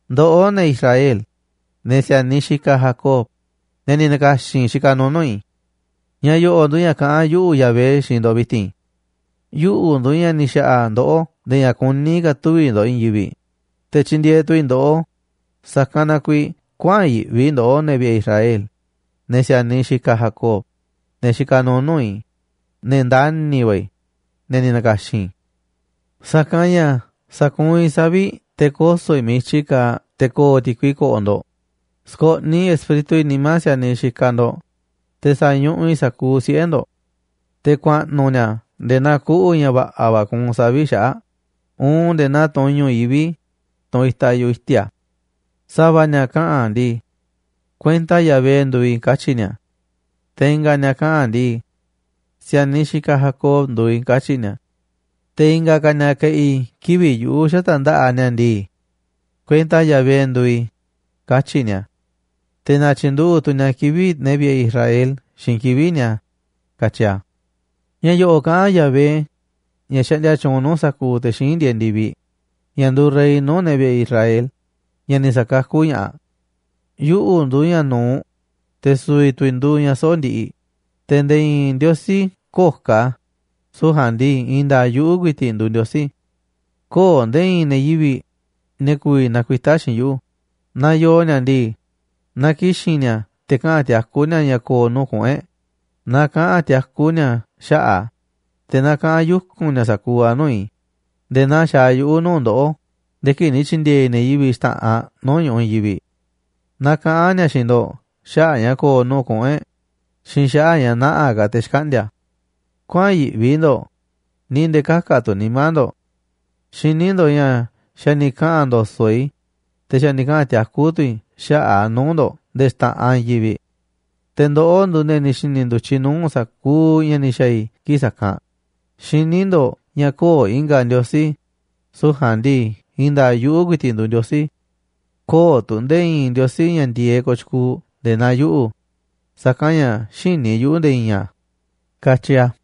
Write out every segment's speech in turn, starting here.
’Ndoꞌó, ne̱ Israel, ne̱ si̱a̱niꞌ xikaꞌ Jacob, ne̱ ni̱ na̱ka̱xi̱n i̱ xikaꞌ nuuꞌ nuu̱ꞌ i̱. Ña̱ yo̱ꞌo̱ꞌ nduuꞌ ña̱ kaꞌán yuꞌu̱, Yahvé, xiinꞌ ndo̱ꞌ vi̱ti̱n. Yuꞌu̱ nduuꞌ ña̱ ni̱ xa̱ꞌa̱ ndoꞌó nde̱e̱ ña̱ kuní ka̱ tuvi̱ ndo̱ꞌ i̱i̱n yivi̱ꞌ, te̱ tyindieeꞌ tu̱ i̱ ndoꞌó. Sa̱kanꞌ na kuiiꞌ kuäa̱n yiꞌvi ndoꞌó, ne̱ vi̱ꞌe̱ Israel, ne̱ si̱a̱niꞌ xikaꞌ Jacob, ne̱ xikaꞌ nuuꞌ nuu̱ꞌ i̱, ne̱ ndani̱ va̱ i̱, ne̱ ni̱ na̱ka̱xi̱n i̱. Sa̱kanꞌ ña̱ sa̱kuunꞌ i̱ savi̱ꞌ te̱ koso̱ i̱ miiꞌ i̱tyi kaaꞌ te̱ ko̱o̱ ti̱kui ko̱ꞌo̱ ndo̱ꞌ. Sko̱ꞌniꞌ Espíritu i̱ nimá si̱a̱niꞌ xikaꞌ ndo̱ꞌ, te̱ sa̱ñuꞌuꞌ i̱ sa̱kuuꞌ siꞌe̱ ndo̱ꞌ. Te̱ ku̱a̱ꞌnu̱ ni̱a̱ nde̱e̱ naa kuꞌu̱ ña̱ va̱ꞌa̱ va̱ kuunꞌ savi̱ꞌ xaꞌa̱ꞌ uun nde̱e̱ naa tunꞌ i̱ñu̱ꞌ yivi̱ꞌ, tunꞌ itaꞌ yu̱ꞌuꞌ i̱ti̱a̱. Sa̱va̱ ni̱a̱ kaꞌa̱n ndii: Kuenta Yahvé nduuꞌ i̱, katyi̱ ni̱a̱. ’Te̱ i̱nga̱ ni̱a̱ kaꞌa̱n ndii: Si̱a̱niꞌ xikaꞌ Jacob nduuꞌ i̱, katyi̱ ni̱a̱. ’Te̱ i̱nga̱ ka̱ ni̱a̱ ke̱ꞌi̱ kivi̱ꞌ yuꞌu̱ xata̱ꞌ nda̱ꞌaꞌ ni̱a̱ ndii: Kuenta Yahvé nduuꞌ i̱, katyi̱ ni̱a̱. Te̱ na̱tyi̱nduꞌu̱ꞌ tu̱ ni̱a̱ kivi̱ꞌ ne̱ vi̱ꞌe̱ Israel xiinꞌ kivi̱ꞌ ni̱a̱”, katyi a̱. Ña̱ yo̱ꞌo̱ꞌ kaꞌán Yahvé, ña̱ xaꞌndia tyuunꞌ nuu̱ꞌ sa̱kuuꞌ te̱ xíinꞌ ndieeꞌ ndi̱viꞌ, ña̱ nduuꞌ rey nuu̱ꞌ ne̱ vi̱ꞌe̱ e̱ꞌ Israel, ña̱ ni̱ sa̱kakú ña̱ꞌaꞌ: “Yuꞌu̱ nduuꞌ ña̱ nu̱uꞌ, te̱ su̱vi̱ tu̱ i̱ nduuꞌ ña̱ soꞌo̱ꞌ ndiꞌiꞌ, te̱ nde̱e̱ i̱i̱n ndiosí köo̱ꞌ ka̱, süu̱ꞌ ja̱a̱nꞌ ndii, i̱i̱n nda̱a̱ꞌ yuꞌu̱ ku̱i̱ti̱ꞌ nduuꞌ Ndiosí. Köo̱ꞌ nde̱e̱ i̱i̱n ne̱ yivi̱ꞌ, ne̱ ku̱vi̱ nakuitá xiinꞌ yuꞌu̱. Naaꞌ yoo ni̱a̱ ndii, na ki̱xi̱n ni̱a̱ te̱ kaꞌa̱n tiakú ni̱a̱ ña̱ ko̱o̱ nuu̱ꞌ kuꞌu̱n e̱ꞌ, na kaꞌa̱n tiakú ni̱a̱ xaꞌa̱ꞌ a̱, te̱ na kaꞌa̱n yuku̱n ni̱a̱ sa̱kuuꞌ a̱ nuu̱ꞌ i̱ nde̱e̱ naa xaaꞌ yuꞌu̱ nuu̱ꞌ ndoꞌó nde̱e̱ kii̱ꞌ ni̱ tyi̱ndi̱e̱e̱ i̱ ne̱ yivi̱ꞌ xta̱ꞌanꞌ nuu̱ꞌ ñu̱ꞌuꞌ i̱i̱n yivi̱ꞌ. Na kaꞌa̱n ni̱a̱ xiinꞌ ndo̱ꞌ xaꞌa̱ꞌ ña̱ ko̱o̱ nuu̱ꞌ kuꞌu̱n e̱ꞌ xiinꞌ xaꞌa̱ꞌ ña̱ nä̱ꞌaꞌ ka̱ te̱ xkaꞌndi̱a̱. Kuäa̱n yiꞌvi ndo̱ꞌ ni̱ nde̱e̱ kä̱ka̱ tu̱ nimá ndo̱ꞌ. Xiní ndo̱ꞌ ña̱ xa̱ ni̱ kaꞌa̱n ndo̱so̱ꞌ i̱, te̱ xa̱ ni̱ kaꞌa̱n tiakú tu̱ i̱ xaꞌa̱ꞌ a̱ nuu̱ꞌ ndo̱ꞌ nde̱e̱ xta̱ꞌanꞌ i̱i̱n yivi̱ꞌ. Te̱ ndoꞌó nduuꞌ ne̱ ni̱ xi̱ni̱ ndu̱tyiꞌ nuu̱ꞌ sa̱kuuꞌ ña̱ ni̱ xa̱a̱ i̱ kii̱ꞌ sa̱kanꞌ. Xiní ndo̱ꞌ ña̱ köo̱ꞌ i̱nga̱ ndiosí, süu̱ꞌ ja̱a̱nꞌ ndii i̱i̱n nda̱a̱ꞌ yuꞌu̱ ku̱i̱ti̱ꞌ nduuꞌ Ndiosí. Köo̱ꞌ tu̱ nde̱e̱ i̱i̱n ndiosí ña̱ ndi̱e̱eꞌ kooꞌ tyukuuꞌ nde̱e̱ naa yuꞌu̱, sa̱kanꞌ ña̱ xïní yuꞌu̱ nde̱e̱ i̱i̱n a̱”, katyi a̱.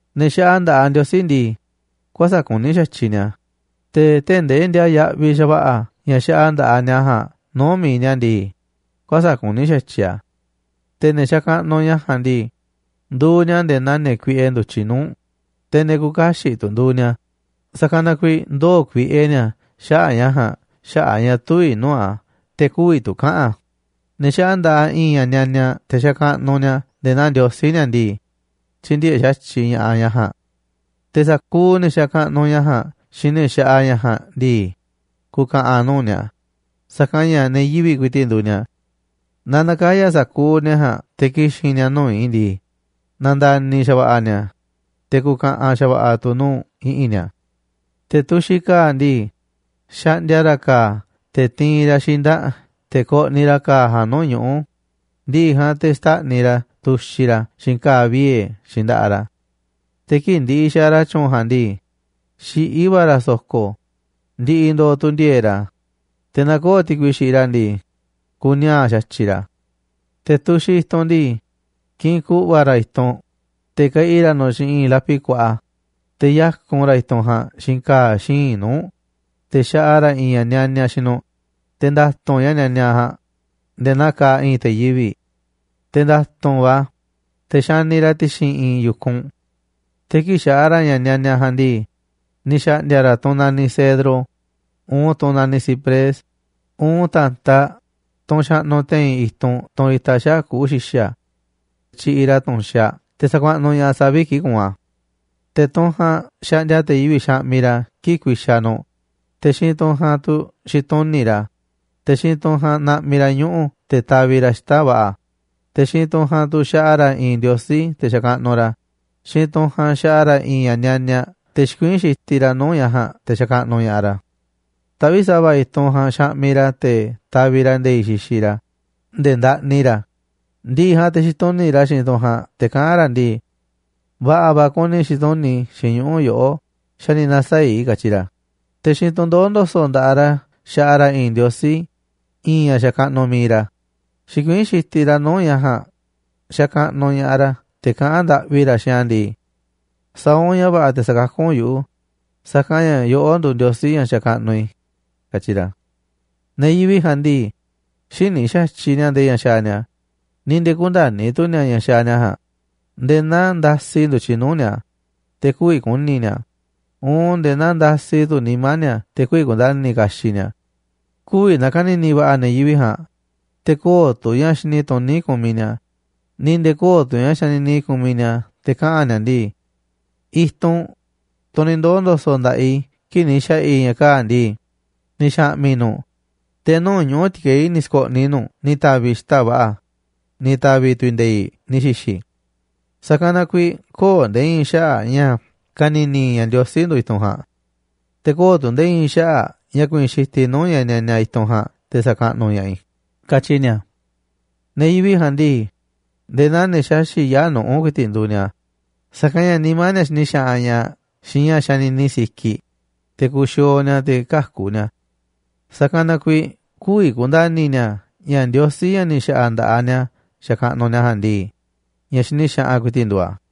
Ne̱ xaꞌa nda̱ꞌaꞌ ndiosí ndii, kuäsa̱ꞌ kuní xa̱tyiꞌ ni̱a̱, te̱ tee̱ꞌ ndee ndiaa yaꞌviꞌ xa̱va̱ꞌa̱ ña̱ xaꞌa nda̱ꞌaꞌ ni̱a̱ ja̱a̱nꞌ nuu̱ꞌ mi̱iꞌ ni̱a̱ ndii, kuäsa̱ꞌ kuní xa̱tyiꞌ a̱. Te̱ ne̱ xakaꞌnuꞌ ña̱ ja̱a̱nꞌ ndii, nduuꞌ ni̱a̱ nde̱e̱ naa ne̱ kuiꞌe ndu̱tyiꞌ nuu̱ꞌ, te̱ ne̱ küuꞌ kaxiꞌ tu̱ nduuꞌ ni̱a̱, sa̱kanꞌ na kuiiꞌ ndoo̱ kuiꞌe ni̱a̱ xaꞌa̱ꞌ ña̱ ja̱a̱nꞌ xaꞌa̱ꞌ a̱ ña̱ tüviꞌ nuu̱ꞌ a̱ te̱ kü̱vi̱ tu̱ kaꞌa̱n a̱. Ne̱ xaꞌa nda̱ꞌaꞌ i̱i̱n ña̱ nianiaꞌ te̱ sa̱kaꞌnuꞌ ni̱a̱ nde̱e̱ naa ndiosí ni̱a̱ ndii, tyïndieeꞌ xa̱tyiꞌ ña̱ꞌaꞌ ña̱ ja̱a̱nꞌ. Te̱ sa̱kuuꞌ ne̱ xakaꞌnuꞌ ña̱ ja̱a̱nꞌ xiinꞌ ne̱ xaꞌa ña̱ ja̱a̱nꞌ ndii, ku̱ka̱ꞌa̱n nuu̱ꞌ ni̱a̱, sa̱kanꞌ ña̱ ne̱ yivi̱ꞌ ku̱i̱ti̱ꞌ nduuꞌ ni̱a̱. Na na̱kaya̱ sa̱kuuꞌ ne̱ ja̱a̱nꞌ te̱ ki̱xi̱n ni̱a̱ nuu̱ꞌ i̱ ndii, na̱nda̱ni̱ xa̱va̱ꞌa̱ ni̱a̱, te̱ ku̱ka̱ꞌa̱n xa̱va̱ꞌa̱ tu̱ nuu̱ꞌ i̱ꞌi̱n ni̱a̱. Te̱ tuxiꞌ ka̱a̱ ndii, xaꞌndia ra̱ ka̱a̱ te̱ tiinꞌ ra̱ xinda̱ꞌ te̱ koꞌniꞌ ra̱ ka̱a̱ ja̱a̱nꞌ nuu̱ꞌ ñuꞌu̱, ndiꞌiꞌ ja̱a̱nꞌ te̱ xtáꞌniꞌ ra̱ a̱ tuxiꞌ ra̱ a̱ xiinꞌ ka̱a̱ viee̱ xiinꞌ nda̱ꞌaꞌ ra̱. Te̱ kii̱ꞌ ndiꞌiꞌ xaaꞌ ra̱ tyu̱u̱n ja̱a̱nꞌ ndii, xiꞌí va̱ ra̱ so̱ko̱, ndiꞌiꞌ ndooꞌ tu̱ ndi̱e̱e̱ꞌ ra̱. Te̱ naaꞌ köo̱ꞌ ti̱kui xiꞌiꞌ ra̱ ndii, kuni̱a̱a̱ꞌ xa̱tyiꞌ ra̱. Te̱ tuxiꞌ i̱tunꞌ ndii, kiꞌinꞌ ku̱ꞌva̱ ra̱ i̱tunꞌ, te̱ keꞌi ra̱ nu̱ꞌ xiinꞌ i̱i̱n lapi kuaꞌa, te̱ yákun ra̱ i̱tunꞌ ja̱a̱nꞌ xiinꞌ ka̱a̱ xíinꞌ nuu̱ꞌ, te̱ xaꞌa ra̱ i̱i̱n ña̱ nianiaꞌ xiinꞌ nu̱ꞌ, te̱ nda̱tu̱nꞌ ña̱ nianiaꞌ ja̱a̱nꞌ nde̱e̱ naa kaaꞌ i̱i̱n te̱ yivi̱ꞌ, te̱ nda̱tu̱nꞌ va̱, te̱ xaniꞌ ra̱ a̱ ti̱xi̱n i̱i̱n yu̱kunꞌ. Te̱ kii̱ꞌ xaꞌa ra̱ ña̱ nianiaꞌ ja̱a̱nꞌ ndii, ni̱ xa̱ꞌndi̱a̱ ra̱ tunꞌ naniꞌ cedro, uun tunꞌ naniꞌ ciprés, uun ta̱ntaꞌ tunꞌ xaꞌnuꞌ te̱i̱n i̱tunꞌ tunꞌ itaꞌ xaꞌa̱ꞌ kuꞌu̱ xi̱xa̱. Tyiꞌiꞌ ra̱ tu̱nxaꞌ te̱ sakuaꞌnuꞌ ña̱ꞌaꞌ savi̱ꞌ kii̱ꞌ kuunꞌ a̱. Te̱ tunꞌ ja̱a̱nꞌ xaꞌndia te̱ yivi̱ꞌ xaꞌmiꞌ ra̱ kii̱ꞌ ku̱i̱xa̱ nu̱ꞌ, te̱ xiinꞌ tunꞌ ja̱a̱nꞌ tu̱ xituni̱ꞌ ra̱, te̱ xiinꞌ tunꞌ ja̱a̱nꞌ naꞌmiꞌ ra̱ ñuꞌu̱ te̱ taviꞌ ra̱ xita̱ꞌ va̱ꞌa̱. Te̱ xiinꞌ tunꞌ ja̱a̱nꞌ tu̱ xaꞌa ra̱ i̱i̱n ndiosí, te̱ xakaꞌnuꞌ ra̱ a̱. Xiinꞌ tunꞌ ja̱a̱nꞌ xaꞌa ra̱ i̱i̱n ña̱ nianiaꞌ te̱ xikuiín xitiꞌ ra̱ nuu̱ꞌ ña̱ ja̱a̱nꞌ te̱ xakaꞌnuꞌ ña̱ꞌaꞌ ra̱. Taꞌvíꞌ sa̱va̱ i̱tunꞌ ja̱a̱nꞌ xaꞌmiꞌ ra̱ te̱ taviꞌ ra̱ nde̱i̱ꞌ xixiꞌ ra̱ nde̱e̱ ndaꞌni ra̱. Ndi̱ꞌi̱ ja̱a̱nꞌ te̱ xituni̱ꞌ tu̱ ra̱ xiinꞌ tunꞌ ja̱a̱nꞌ te̱ kaꞌán ra̱ ndii: “Va̱ꞌa̱ va̱ kuni i̱ xituni̱ꞌ xiinꞌ ñuꞌu̱ yoꞌoꞌ xa̱ ni̱ na̱saa̱ꞌ i̱”, katyi ra̱. Te̱ xiinꞌ tunꞌ ndoó ndo̱so̱ꞌ nda̱ꞌaꞌ ra̱ xaꞌa ra̱ i̱i̱n ndiosí, i̱i̱n ña̱ xakaꞌnuꞌ mi̱iꞌ ra̱. Xikuiín xitiꞌ ra̱ nuu̱ꞌ ña̱ ja̱a̱nꞌ xakaꞌnuꞌ ña̱ꞌaꞌ ra̱ te̱ kaꞌán ndaꞌvi ra̱ xiinꞌ a̱ ndii: “Sa̱a̱ u̱nꞌ ña̱ va̱ꞌa̱ te̱ sa̱kakú u̱nꞌ yuꞌu̱, sa̱kanꞌ ña̱ yoꞌó nduuꞌ ndiosí ña̱ xakaꞌnuꞌ i̱”, katyi ra̱. Ne̱ yivi̱ꞌ ja̱a̱nꞌ ndii, xïní xa̱tyiꞌ ni̱a̱ ndee ña̱ xaaꞌ ni̱a̱, ni̱ nde̱e̱ kündani̱ tu̱ ni̱a̱ ña̱ xaaꞌ ni̱a̱ ja̱a̱nꞌ, nde̱e̱ naa ndasi ndu̱tyiꞌ nuu̱ꞌ ni̱a̱, te̱ kü̱vi̱ ku̱ni̱ ni̱a̱, uun nde̱e̱ naa ndasi tu̱ nimá ni̱a̱ te̱ kü̱vi̱ ku̱nda̱ni̱ kaxiꞌ ni̱a̱. Kü̱vi̱ na̱ka̱ni̱ni̱ va̱ꞌa̱ ne̱ yivi̱ꞌ ja̱a̱nꞌ, te̱ köo̱ꞌ tu̱ ña̱ xini tuní kumiꞌ ni̱a̱, ni̱ nde̱e̱ köo̱ꞌ tu̱ ña̱ xanini kumiꞌ ni̱a̱ te̱ kaꞌa̱n ni̱a̱ ndii: “I̱tunꞌ, tunꞌ ni̱ ndoo̱ ndo̱so̱ꞌ nda̱ꞌaꞌ i̱ kii̱ꞌ ni̱ xa̱ꞌa̱ i̱ ña̱ kaa̱ꞌ ndii, ni̱ xa̱ꞌmi̱ i̱ nu̱ꞌ, te̱ nuu̱ꞌ ñuꞌu̱ ti̱kei̱ ni̱ sko̱ꞌniꞌ i̱ nu̱ꞌ ni̱ ta̱vi̱ i̱ xita̱ꞌ va̱ꞌa̱, ni̱ ta̱vi̱ tu̱ i̱ nde̱i̱ꞌ ni̱ xi̱xi̱ i̱. Sa̱kanꞌ na kuiiꞌ köo̱ꞌ nde̱e̱ i̱i̱n xaꞌa̱ꞌ ña̱ ka̱ni̱ni̱ i̱ ña̱ ndiosí nduuꞌ i̱tunꞌ ja̱a̱nꞌ. Te̱ köo̱ꞌ tu̱ nde̱e̱ i̱i̱n xaꞌa̱ꞌ ña̱ ku̱i̱i̱n xitiꞌ i̱ nuu̱ꞌ ña̱ nianiaꞌ i̱tunꞌ ja̱a̱nꞌ te̱ sa̱kaꞌnuꞌ ña̱ꞌaꞌ i̱”, katyi ni̱a̱. Ne̱ yivi̱ꞌ ja̱a̱nꞌ ndii, nde̱e̱ naa ne̱ xaxi̱ꞌ yaa̱ꞌ nuꞌu̱ ku̱i̱ti̱ꞌ nduuꞌ ni̱a̱, sa̱kanꞌ ña̱ nimá ni̱a̱ xini xaꞌanꞌ ña̱ꞌaꞌ xiinꞌ ña̱ xanini sikiꞌ, te̱ kuxiooꞌ ni̱a̱, te̱ käku̱ ni̱a̱. Sa̱kanꞌ na kuiiꞌ kü̱vi̱ ku̱nda̱ni̱ ni̱a̱ ña̱ ndiosí, ña̱ ni̱ xa̱ꞌa̱ nda̱ꞌaꞌ ni̱a̱ xakaꞌnuꞌ ni̱a̱ ja̱a̱nꞌ ndii, ña̱ xini xaꞌanꞌ ku̱i̱ti̱ꞌ nduuꞌ a̱.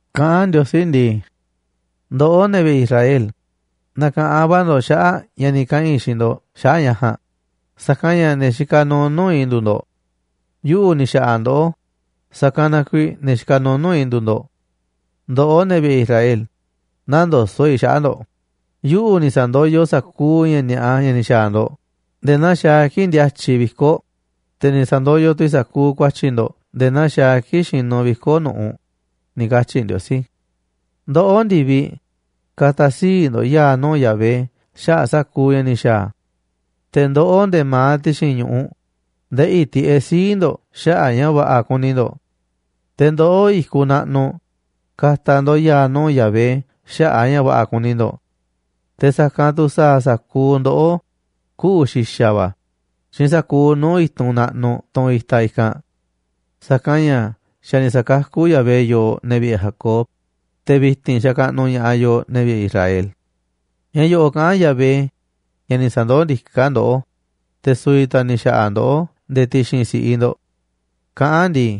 Kaꞌán Ndiosí ndii: “Ndoꞌó, ne̱ vi̱ꞌe̱ Israel, na̱ka̱ꞌanꞌ va̱ ndo̱ꞌ xaꞌa̱ꞌ ña̱ ni̱ kaꞌa̱n i̱ xiinꞌ ndo̱ꞌ xaꞌa̱ꞌ ña̱ ja̱a̱nꞌ, sa̱kanꞌ ña̱ ne̱ xikaꞌ nuuꞌ nuu̱ꞌ i̱ nduuꞌ ndo̱ꞌ. Yuꞌu̱ ni̱ xa̱ꞌa̱ ndoꞌó, sa̱kanꞌ na kuiiꞌ ne̱ xikaꞌ nuuꞌ nuu̱ꞌ i̱ nduuꞌ ndo̱ꞌ. Ndoꞌó, ne̱ vi̱ꞌe̱ Israel, nä̱ndoso̱ꞌ i̱ xaꞌa̱ꞌ ndo̱ꞌ. Yuꞌu̱ ni̱ sa̱ndoyoꞌ sa̱kuuꞌ ña̱ ni̱a̱ꞌa ña̱ ni̱ xa̱a̱ ndo̱ꞌ nde̱e̱ naa xaaꞌ a̱ kii̱ꞌ ndíátyiꞌ viko̱ꞌ, te̱ ni̱ sa̱ndoyoꞌ tu̱ i̱ sa̱kuuꞌ ku̱a̱tyi̱ ndo̱ꞌ nde̱e̱ naa xaaꞌ a̱ kii̱ꞌ xinuꞌ viko̱ꞌ nu̱ꞌuꞌ”, ni̱ katyi̱ Ndiosí. Ndoꞌó, ndi̱viꞌ, ka̱ta̱ sii̱ꞌ ndo̱ꞌ ya̱a̱ nuu̱ꞌ Yahvé xaꞌa̱ꞌ sa̱kuuꞌ ña̱ ni̱ xa̱a̱ a̱. Te̱ ndoꞌó, nde̱e̱ ma̱aꞌ ti̱xi̱n ñu̱ꞌuꞌ ndeꞌi̱ tiꞌeꞌ sii̱ꞌ ndo̱ꞌ xaꞌa̱ꞌ a̱ ña̱ va̱ꞌa̱ kuni ndo̱ꞌ. Te̱ ndoꞌó, i̱kuꞌ naꞌnuꞌ, ka̱ta̱ ndo̱ꞌ ya̱a̱ nuu̱ꞌ Yahvé xaꞌa̱ꞌ a̱ ña̱ va̱ꞌa̱ kuni ndo̱ꞌ. Te̱ sa̱kanꞌ tu̱ sa̱a̱ sa̱kuuꞌ ndoꞌó kuꞌu̱ xi̱xa̱ va̱ xiinꞌ sa̱kuuꞌ nuu̱ꞌ i̱tunꞌ naꞌnuꞌ tunꞌ itaꞌ i̱kanꞌ. Sa̱kanꞌ ña̱ xa̱ ni̱ sa̱kakú Yahvé yooꞌ, ne̱ vi̱ꞌe̱ Jacob, te̱ vi̱ti̱n xakaꞌnuꞌ ña̱ꞌaꞌ yooꞌ, ne̱ vi̱ꞌe̱ Israel. Ña̱ yo̱ꞌo̱ꞌ kaꞌán Yahvé, ña̱ ni̱ sa̱ndoó ndiká ndoꞌó, te̱ su̱vi̱ tu̱ a̱ ni̱ xa̱ꞌa̱ ndoꞌó nde̱e̱ ti̱xi̱n si̱ꞌiꞌ ndo̱ꞌ kaꞌán a̱ ndii: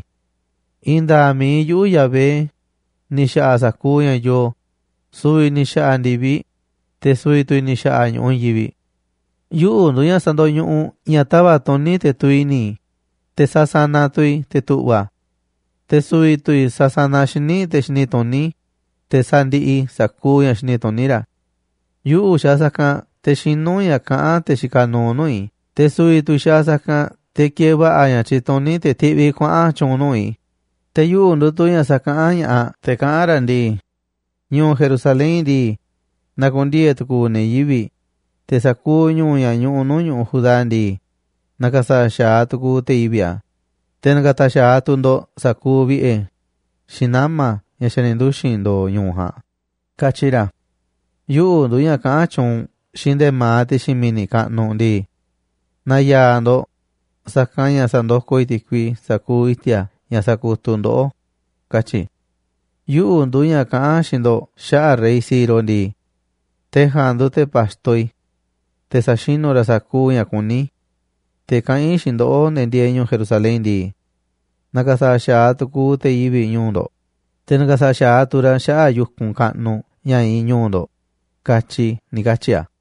“I̱i̱n nda̱a̱ꞌ mi̱iꞌ yuꞌu̱, Yahvé, ni̱ xaꞌa sa̱kuuꞌ ña̱ yoo, su̱vi̱ i̱ ni̱ xa̱ꞌa̱ ndi̱viꞌ, te̱ su̱vi̱ tu̱ i̱ ni̱ xa̱ꞌa̱ ñu̱ꞌuꞌ i̱i̱n yivi̱ꞌ. Yuꞌu̱ nduuꞌ ña̱ sandoñuꞌuꞌ ña̱ tava̱ꞌ tuni̱ te̱ tuviꞌ i̱ni̱, te̱ sasanaꞌ tu̱ i̱ te̱ tu̱ꞌva̱. Te̱ su̱vi̱ tu̱ i̱ sasanaꞌ xíniꞌ te̱ xini tuní, te̱ sandiꞌiꞌ i̱ sa̱kuuꞌ ña̱ xini tuní ra̱. Yuꞌu̱ xaaꞌ sa̱kanꞌ te̱ xinú ña̱ kaꞌán te̱ xikaꞌ nuuꞌ nuu̱ꞌ i̱, te̱ su̱vi̱ tu̱ i̱ xaaꞌ sa̱kanꞌ te̱ kieeꞌ va̱ꞌa̱ ña̱ tyituní, te̱ tiꞌviꞌ i̱ kuaꞌa̱n tyu̱u̱n nuu̱ꞌ i̱. Te̱ yuꞌu̱ nduuꞌ tu̱ ña̱ sakaꞌán ña̱ꞌaꞌ, te̱ kaꞌán ra̱ ndii: Ñu̱u̱ Jerusalén ndii, na̱ku̱ndiee̱ tu̱ku̱u̱ ne̱ yivi̱ꞌ, te̱ sa̱kuuꞌ ñu̱u̱ ña̱ ñuꞌuꞌ nuu̱ꞌ ñu̱ꞌuꞌ Judá ndii, na̱ka̱sa̱ꞌa̱ xa̱aꞌ tu̱ku̱u̱ te̱ yivi̱ꞌ a̱, te̱ na̱ka̱ta̱ xa̱aꞌ tu̱ ndo̱ꞌ sa̱kuuꞌ vi̱ꞌe̱, xiinꞌ nama̱, ña̱ xa̱ ni̱ nduxi̱n ndo̱o̱ ñu̱u̱ ja̱a̱nꞌ, katyi ra̱. Yuꞌu̱ nduuꞌ ña̱ kaꞌán tyuunꞌ xiinꞌ nde̱ma̱aꞌ ti̱xi̱n mi̱ni̱ kaꞌnuꞌ ndii: Na̱ya̱a̱ ndo̱ꞌ, sa̱kanꞌ ña̱ sa̱ndokoꞌ i̱ ti̱kui sa̱kuuꞌ i̱ti̱a̱ ña̱ sakutuꞌ ndoꞌó, katyi i̱. Yuꞌu̱ nduuꞌ ña̱ kaꞌán xiinꞌ ndo̱ꞌ xaꞌa̱ꞌ rey Ciro ndii: Te̱ ja̱a̱nꞌ nduuꞌ te̱ pa̱xto i̱. Te̱ sa̱xinu̱ ra̱ sa̱kuuꞌ ña̱ kuní i̱. Te̱ kaꞌán i̱ xiinꞌ ndoꞌó, ne̱ ndieeꞌ ñu̱u̱ Jerusalén ndii: Na̱ka̱sa̱ꞌa̱ xa̱aꞌ tu̱ku̱u̱ te̱ yivi̱ꞌ ñu̱u̱ ndo̱ꞌ, te̱ na̱ka̱sa̱ꞌa̱ xa̱aꞌ tu̱ ra̱ xaꞌa̱ꞌ yu̱kunꞌ kaꞌnuꞌ ña̱ iinꞌ ñu̱u̱ ndo̱ꞌ, katyi i̱”, ni̱ katyi̱ a̱.